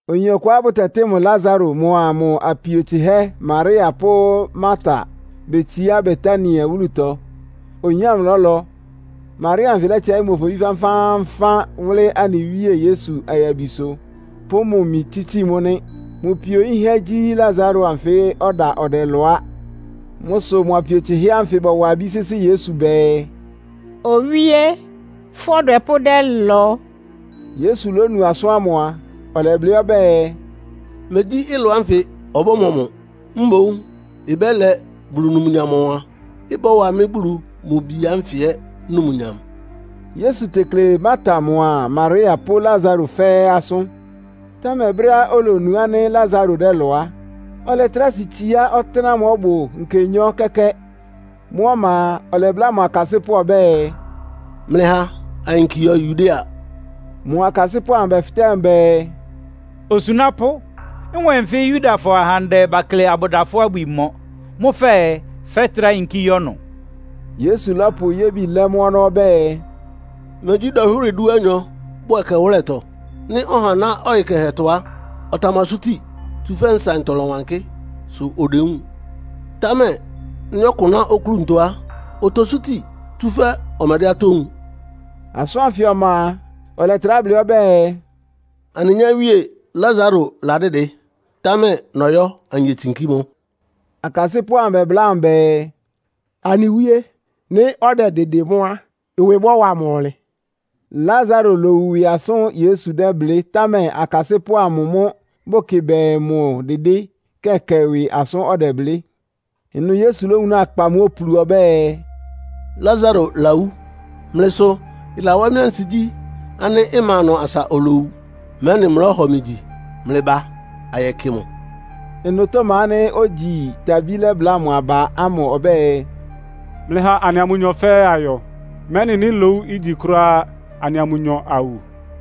Oyin ɔkʋá bʋtɛtɩ́ mʋ Lasaro mʋa mʋ apio tsɩhɛ́ Maria pʋ́ Marta betsiá Betania wúlutɔ. Oyin ámʋ lɔ́lɔ. Maria anfɩ lɛ́tsɛɩ́ mʋ ofobí fánfáánfán wʋ́lɩ́ anɩ Wíe Yesu ayabisʋ, pʋ́ mʋ imi tsítsi mʋ́ nɩ. Mʋ pio yínhɛ́ gyí Lasaro anfɩ́ ɔda ɔdɛlɔ á. Mʋ́ sʋ mʋ apio tsɩhɛ́ ánfɩ bɔwa abí sɩ́sɩ́ Yesu bɛɛ, “Owíé, fʋ́ ɔdwɛpʋ́ dɛ́lɔ.” Yesu lónu asʋ́n ámʋ a, ɔlɛblɩ́ ɔbɛ́ɛ, “Megyí ɩlɔ ánfɩ ɔbɔ́mɔ mʋ, mboún ɩbɛ́lɛ Bulu numnyam ɔwan. Ɩbɔ́wa mɩ́ Bulu mʋ Bi ánfɩ ɛ́ numnyam.” Yesu tekle Marta mʋa Maria pʋ́ Lasaro fɛ́ɛ́ asʋ́n. Támɛ brɛ́á olonu ánɩ́ Lasaro dɛ́lɔ á, ɔlɛtrá si tsiá ɔtɩ́nɛ́á ɔbʋ nkenyɔ́ kɛ́kɛ́. Mʋ́ ɔma a, ɔlɛbláa mʋ akasɩ́pʋ́ ɔbɛ́ɛ, “Mlɩha ayinki yɔ Yudea.” Mʋ akasɩ́pʋ́ amʋ bɛfɩtɛ́ mʋ bɛɛ, “Osunápʋ́, nwɛ́n nfɩ Yudafɔ ahandɛ bakle abʋda fʋ́ abwi mɔ. Mʋ́ fɛɛ fɛ́trá yinkí yɔ́ ɩnʋ?” Yesu lɔ́pʋ yébi lɛ́ mʋ́ ɔnɔ́ ɔbɛ́ɛ, “Megyí dɔnhwɩ́rɩ dúanyɔ bʋ ɛkɛwʋ́lɛtɔ? Nɩ́ ɔha ná ɔyɩ kɛhɛtɔ á, ɔtamasúti, tsúfɛ́ nsaɩntɔ lɔ́wankɩ́, sʋ odewúun. Támɛ nɩ́ ɔkʋ ná oklúntɔ á, otosúti, tsúfɛ́ ɔmɛdɛ́ atɔ́ wúun.” Asʋ́n ánfɩ ɔma a, ɔlɛtrá blɩ́ ɔbɛ́ɛ, “Anɩ nyáwíe Lasaro ladɩ́dɩ, támɛ nɔyɔ́ anyetsinkí mʋ.” Akasɩ́pʋ́ amʋ bɛbláa mʋ bɛɛ, “Anɩ Wíe, nɩ́ ɔdɛdɩdɩ mʋ́ á, ɩwɩ bɔ́wa mʋ ɔnlɩn!” Lasaro lowu ɩwɩ asʋ́n Yesu dɛ́blɩ́, támɛ akasɩ́pʋ́ amʋ mʋ́ bʋkɩ bɛɛ mʋ dɩdɩ́ kɛkɛ ɩwɩ asʋ́n ɔdɛblɩ́. Ɩnʋ Yesu lówunáa kpa mʋ́ opulu ɔbɛ́ɛ, “Lasaro lawú. Mlɩ sʋ ɩlawá mɩ́ ansigyí ánɩ́ mma ɩnʋ asa olowu, mɛ́nɩ mlɔ́hɔ mɩ gyi. Mlɩba ayɛkɩ mʋ.” Ɩnʋ Toma ánɩ́ ogyi Tabí lɛ́bláa mʋ aba ámʋ ɔbɛ́ɛ, “Mlɩha anɩa mʋnyɔ fɛ́ɛ́ ayɔ, mɛ́nɩ nɩ́ lowu ígyi kʋ́ráá á, anɩa mʋnyɔ awu!”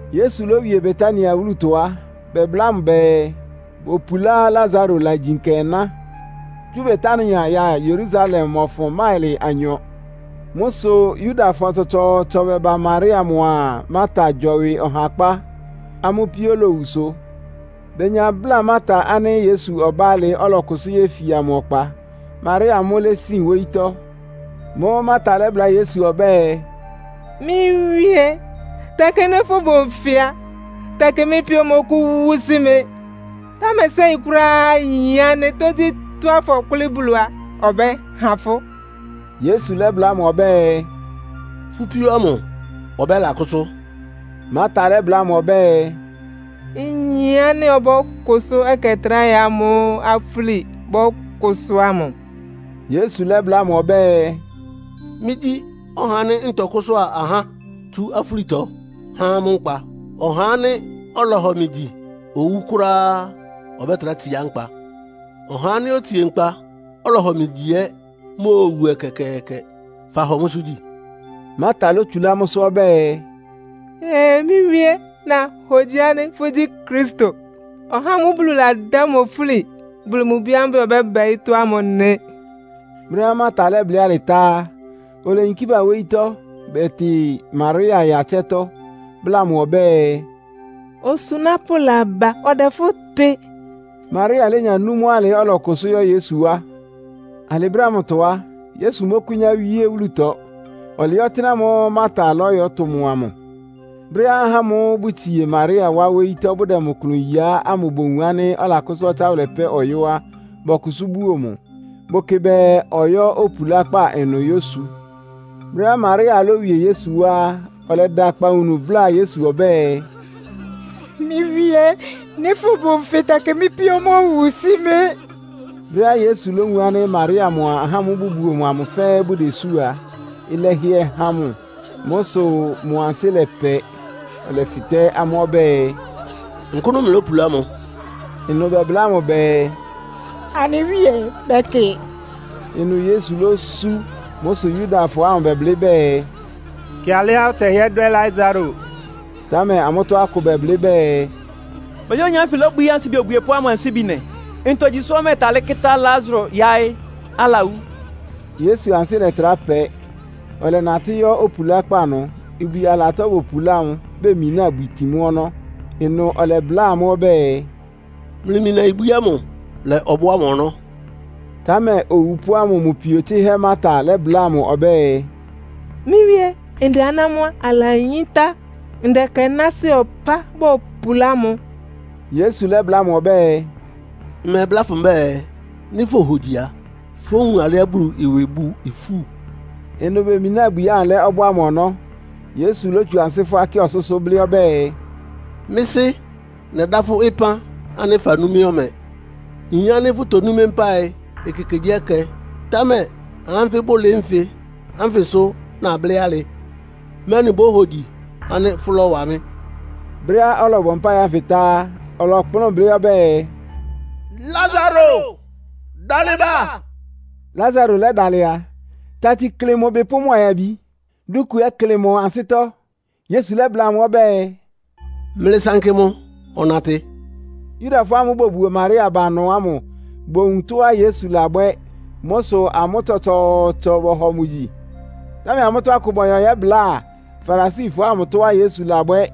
Yesu lówie Betania wúlutɔ á, bɛbláa mʋ bɛɛ bopulá Lasaro ɩlagyi nkɛná. Tsú Betania ya Yerusalem mɔfʋn máɩlɩ anyɔ. Mʋ́ sʋ Yudafɔ tsɔtsɔɔtsɔ bɛba Maria mʋa Marta gyɔwɩ ɔhakpá, amʋ́ píó lowu sʋ. Benya bláa Marta ánɩ́ Yesu ɔbá alɩ, ɔlɔkʋsʋ́ yéfia mʋ ɔkpa. Maria mʋ́ lésin wóyítɔ́. Mʋ́ʋ́ Marta lɛ́bláa Yesu ɔbɛ́ɛ, “Mɩ́ Wíe, tɛkɩ nɩ́ fʋbʋ nfɩ á, tɛkɩ mɩ́ píó mówu sí mɩ́. Támɛ séi kʋ́ráá nyin ánɩ́ tógyítɔ́á fɔ́kʋlɩ́ Bulu á, ɔbɛ́ha fʋ́.” Yesu lɛ́bláa mʋ ɔbɛ́ɛ, “Fʋ́ píó ámʋ ɔbɛ́lakʋ́sʋ́.” Marta lɛ́bláa mʋ ɔbɛ́ɛ, “Nyin ánɩ́ ɔbɔ́kʋsʋ́ ɛkɛ tráhɛ amʋ́ʋ́ afúli bɔ́kʋsʋ́ ámʋ.” Yesu lɛ́bláa mʋ ɔbɛ́ɛ, “Mɩ́gyí ɔhá ánɩ́ ntɔkʋ́sʋ́a ahá tsú afúlitɔ, há amʋ́ nkpa. Ɔhá ánɩ́ ɔlɔhɔ mɩ gyi owú kʋ́ráá á, ɔbɛ́trá tsiá nkpa. Ɔhá ánɩ́ otsie nkpa, ɔlɔhɔ mɩ gyi ɛ́ móowu ɛkɛkɛɛkɛ. Fahɔ mʋ́sʋ́ gyi?” Marta lótsulá mʋ́sʋ́ ɔbɛ́ɛ, “Ee! Mɩ́ Wíe, nahogyi ánɩ́ fʋ́gyí Kristo, (ɔhá ámʋ́ʋ́ Bulu ladá mʋ ofúli), Bulu mʋ Bi ámʋ́ʋ́ bɛɛ ɔbɛ́ba ɔyɩ́tɔ́ ámʋ nɩ.” Brɛ́á Marta lɛ́blɩ́ alɩ tá á, oleyinkí ba wóyítɔ́ bɛtɩ Maria ya ɩtsɛ́tɔ́, bláa mʋ ɔbɛ́ɛ, “Osunápʋ́ laba, ɔdɛ fʋ́ tɩ.” Maria lénya nú mʋ́ alɩ, ɔlɔkʋsʋ́ yɔ́ Yesu wá. (Alɩ brɛ́ ámʋtɔ á, Yesu mɔ́kʋ́nyá wíé wúlutɔ. Ɔlɩɩ́ ɔtɩ́nɛ́ ámʋ́ʋ́ Marta lɔ́yɔ́tʋ mʋ amʋ.) Brɛ́á ahá ámʋ́ʋ́ bʋtsie Maria wá wóyítɔ́, bʋdɛ mʋ klʋn yiá ámʋ bowun ánɩ́ alakʋ́sʋ́ ɔtsáwʋlɛ pɛ́ ɔyɔ́ á, bɔkʋsʋ́ buo mʋ. Bʋkɩ bɛɛ ɔyɔ́ opulákpá ɩnʋ yósu. Brɛ́á Maria lówie Yesu wá á, ɔlɛda akpawunu, bláa Yesu ɔbɛ́ɛ, “Mɩ́ Wíé, nɩ́ fʋbʋ nfɩ á, tɛkɩ mɩ́ píó mówu sí mɩ́!” Brɛ́á Yesu lówun ánɩ́ Maria mʋa ahá ámʋ́ʋ́ bʋbuo mʋ amʋ fɛ́ɛ́ bʋdesú a, ɩlɛhɩɛ han mʋ. Mʋ́ sʋ mʋ ansɩ́ lɛpɛ. Ɔlɛfɩtɛ́ amʋ́ ɔbɛ́ɛ, “Nkʋ́nʋ́ mlɩlópulá mʋ.” Ɩnʋ bɛbláa mʋ bɛɛ, “Anɩ Wíe, bɛkɩ.” Ɩnʋ Yesu lósú. Mʋ́ sʋ Yudafɔ ámʋ bɛblɩ́ bɛɛ, “Kɩ alɩá ɔtɛhɩ́ɛ́ dwɛ́ Lasaro!” Támɛ amʋ́tɔ́ akʋ bɛblɩ́ bɛɛ, “Megyí oyin ánfɩ lóbwií ansibi obwiepʋ́ ámʋ ansíbi nɩ. Ntogyi sʋ́ ɔmɛtalɩ́ kɩ́tá Lasaro yáɩ́, alawú?” Yesu ansɩ́ lɛ́trá pɛ́, ɔlɛnatɩ́ yɔ́ opulákpá ɩnʋ. Ibwi alatɔ bopulá mʋ, bemináa ibwi tin mʋ́ ɔnɔ́. Ɩnʋ ɔlɛbláa amʋ́ ɔbɛ́ɛ, “Mlɩmina ibwi ámʋ lɛ ɔbɔ́ ámʋ ɔnɔ́.” Támɛ owupʋ́ ámʋ mʋ pio tsɩ́hɛ́ Marta lɛ́bláa mʋ ɔbɛ́ɛ, “Mɩ́ Wíé, ndɛ aná mʋ́ á, alayíntá. Ndɛ ɛkɛ náásɩ́ ɔpá bopulá mʋ.” Yesu lɛ́bláa mʋ ɔbɛ́ɛ, “Mmɛbláa fʋ mbɛ́ɛ nɩ́ fohogyi a, fówun alɩá Bulu ɩwɩ bʋ ifú?” Ɩnʋ bemináa ibwi ámʋ lɛ́ ɔbɔ́ ámʋ ɔnɔ́. Yesu lótsu ansɩ́ fʋ́á kɩ ɔsʋ́sʋ́, blɩ́ ɔbɛ́ɛ, “Mɩ́ Sɩ́, nɛdá fʋ́ ɩpán ánɩ́ fanú mɩ́ ɔmɛ. Nyin ánɩ́ fʋtonú mɩ́ mpáɩ ekekegyíɛkɛ. Támɛ ahá ánfɩ bʋlɩɩ́ nfɩ ánfɩ sʋ́ nablɩ́ alɩ, mɛ́nɩ bóhogyi ánɩ́ fʋ́lɔ́wa mɩ́.” Brɛ́á ɔlɔbɔ mpáɩ ánfɩ tá á, ɔlɔkplʋ́n blɩ́ ɔbɛ́ɛ, “Lasaro, dalɩ ba!” Lasaro lɛ́dalɩ a, tati klɩ mʋ ɩbɩ pʋ́ mʋ ayabi. Dúku ɛ́ klɩ mʋ ansɩ́tɔ́. Yesu lɛ́bláa amʋ́ ɔbɛ́ɛ, “Mlɩsankɩ mʋ ɔnatɩ.” Yudafɔ ámʋ́ʋ́ bobuo Maria ba ɩnʋ ámʋ bowun tɔ́á Yesu labwɛ́. Mʋ́ sʋ amʋ́ tsɔtsɔɔtsɔ bɔhɔ mʋ gyi. Támɛ amʋ́tɔ́ akʋ bɔyɔ yɛ́bláa Farisifɔ ámʋ tɔ́á Yesu labwɛ́.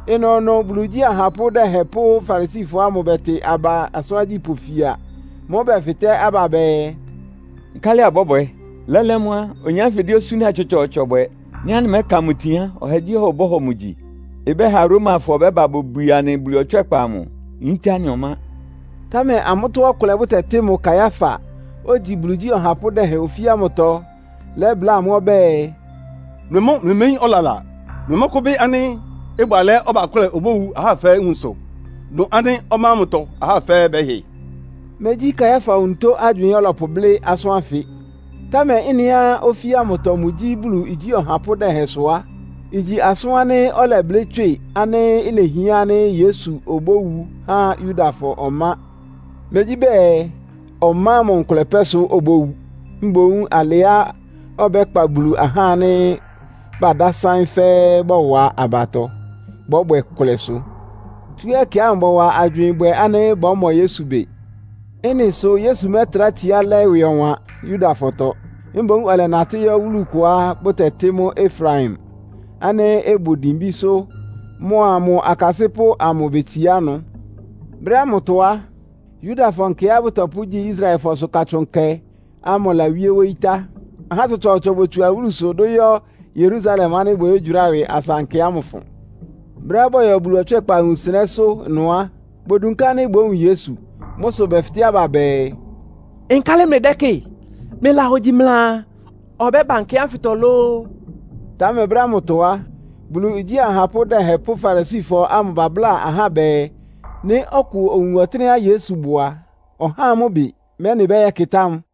Ɩnʋnʋ Bulu igyí ahapʋ́ dɛhɛn pʋ́ Farisifɔ ámʋ bɛtɩ aba asʋ́n agyípʋ́ fia. Mʋ́ʋ́ bɛfɩtɛ́ aba bɛɛ, “Nkálɩ abɔ́bwɛ? Lɛ́lɛ́ mʋ́ á, oyin ánfɩ dɛ́ osúna tsɔtsɔɔtsɔ bwɛ. Nɩ́ anɩmɛ́ka mʋ itin á, ɔhagyíɔha ɔbɔ́hɔ mʋ gyi. Ɩbɛ́ha Romafɔ bɛ́ba bobwie anɩ Bulu ɔtswɛ́kpa amʋ, yíntá anɩ ɔmá!” Támɛ amʋ́tɔ́ ɔkʋlɛá bʋtɛtɩ́ mʋ Kaiafa, ogyi Bulu igyí ɔhapʋ́ dɛhɛn ofí ámʋtɔ lɛ́bláa amʋ́ ɔbɛ́ɛ, “Mlɩ mʋ́ mlɩméyín ɔlala! Mlɩmɔ́kʋ́bɩ́ ánɩ́ ɩbʋ alɛ́á ɔbakʋ́lɛ obówu ahá fɛ́ɛ́ nwunsʋ, dʋn ánɩ́ ɔmá ámʋtɔ ahá fɛ́ɛ́ bɛ́hɩ?” Megyí Kaiafa onutó agywɩɩn ɔ́lɔpʋblɩ́ asʋ́n ánfɩ. Támɛ ɩ́nɩá ofí ámʋtɔ mʋgyí Bulu igyí ɔhapʋ́ dɛhɛn sʋ á, igyi asʋ́n ánɩ́ ɔlɛblɩ́ tswɩ ánɩ́ ilehián ánɩ́ Yesu obówu há Yudafɔ ɔmá. Megyí bɛɛ ɔmá ámʋ nkʋlɛ pɛ́ sʋ obówu, mboún alɩá ɔbɛ́kpa Bulu ahá ánɩ́ badásáɩ́n fɛ́ɛ́ bɔwa abatɔ, bɔ́bwɛ ɩkʋlɛ sʋ. Tsú ɛkɛ ámʋ bɔwa agywɩɩn bwɛ ánɩ́ bɔ́mɔ Yesu bɩ. Ɩ́nɩ sʋ Yesu mɛ́trá tsiá lɛ́ ɩwɩ ɔwan Yudafɔtɔ. Mboún ɔlɛnatɩ́ yɔ́ wúlu kʋá bʋtɛtɩ́ mʋ́ Efraim, ánɩ́ ɩbʋ dimbísʋ́. Mʋa mʋ akasɩ́pʋ́ amʋ betsiá ɩnʋ. Brɛ́ ámʋtɔ á, Yudafɔ nkɛá bɔ́pʋgyi Israelfɔsʋ Katsʋn Nkɛ ámʋ lawíé wóyí tá. Ahá tsɔtsɔɔtsɔ botsu awúlusʋ dʋ́ yɔ́ Yerusalem ánɩ́ bɔyɔ́gyʋráa ɩwɩ asa nkɛ ámʋ ɩfʋn. Brɛ́á bɔyɔ Bulu ɔtswɛ́kpa wunsɩnɛ́sʋ́ ɩnʋ á, bodunká ánɩ́ bówun Yesu. Mʋ́ sʋ bɛfɩtɛ́ aba bɛɛ, “Nkálɩ mlɩdɛ́kɩ́ɩ? Mlɩlahogyi mlɩaa, ɔbɛ́ba nkɛ ánfɩtɔ lóó?” Támɛ brɛ́ ámʋtɔ á, Bulu igyí ahapʋ́ dɛhɛn pʋ́ Farisifɔ ámʋ babláa ahá bɛɛ, nɩ́ ɔkʋ owun ɔtɩ́nɛ́á Yesu bʋ a, ɔhá amʋ́ ɩbɩ, mɛ́nɩ bɛyɛ́kɩtá mʋ.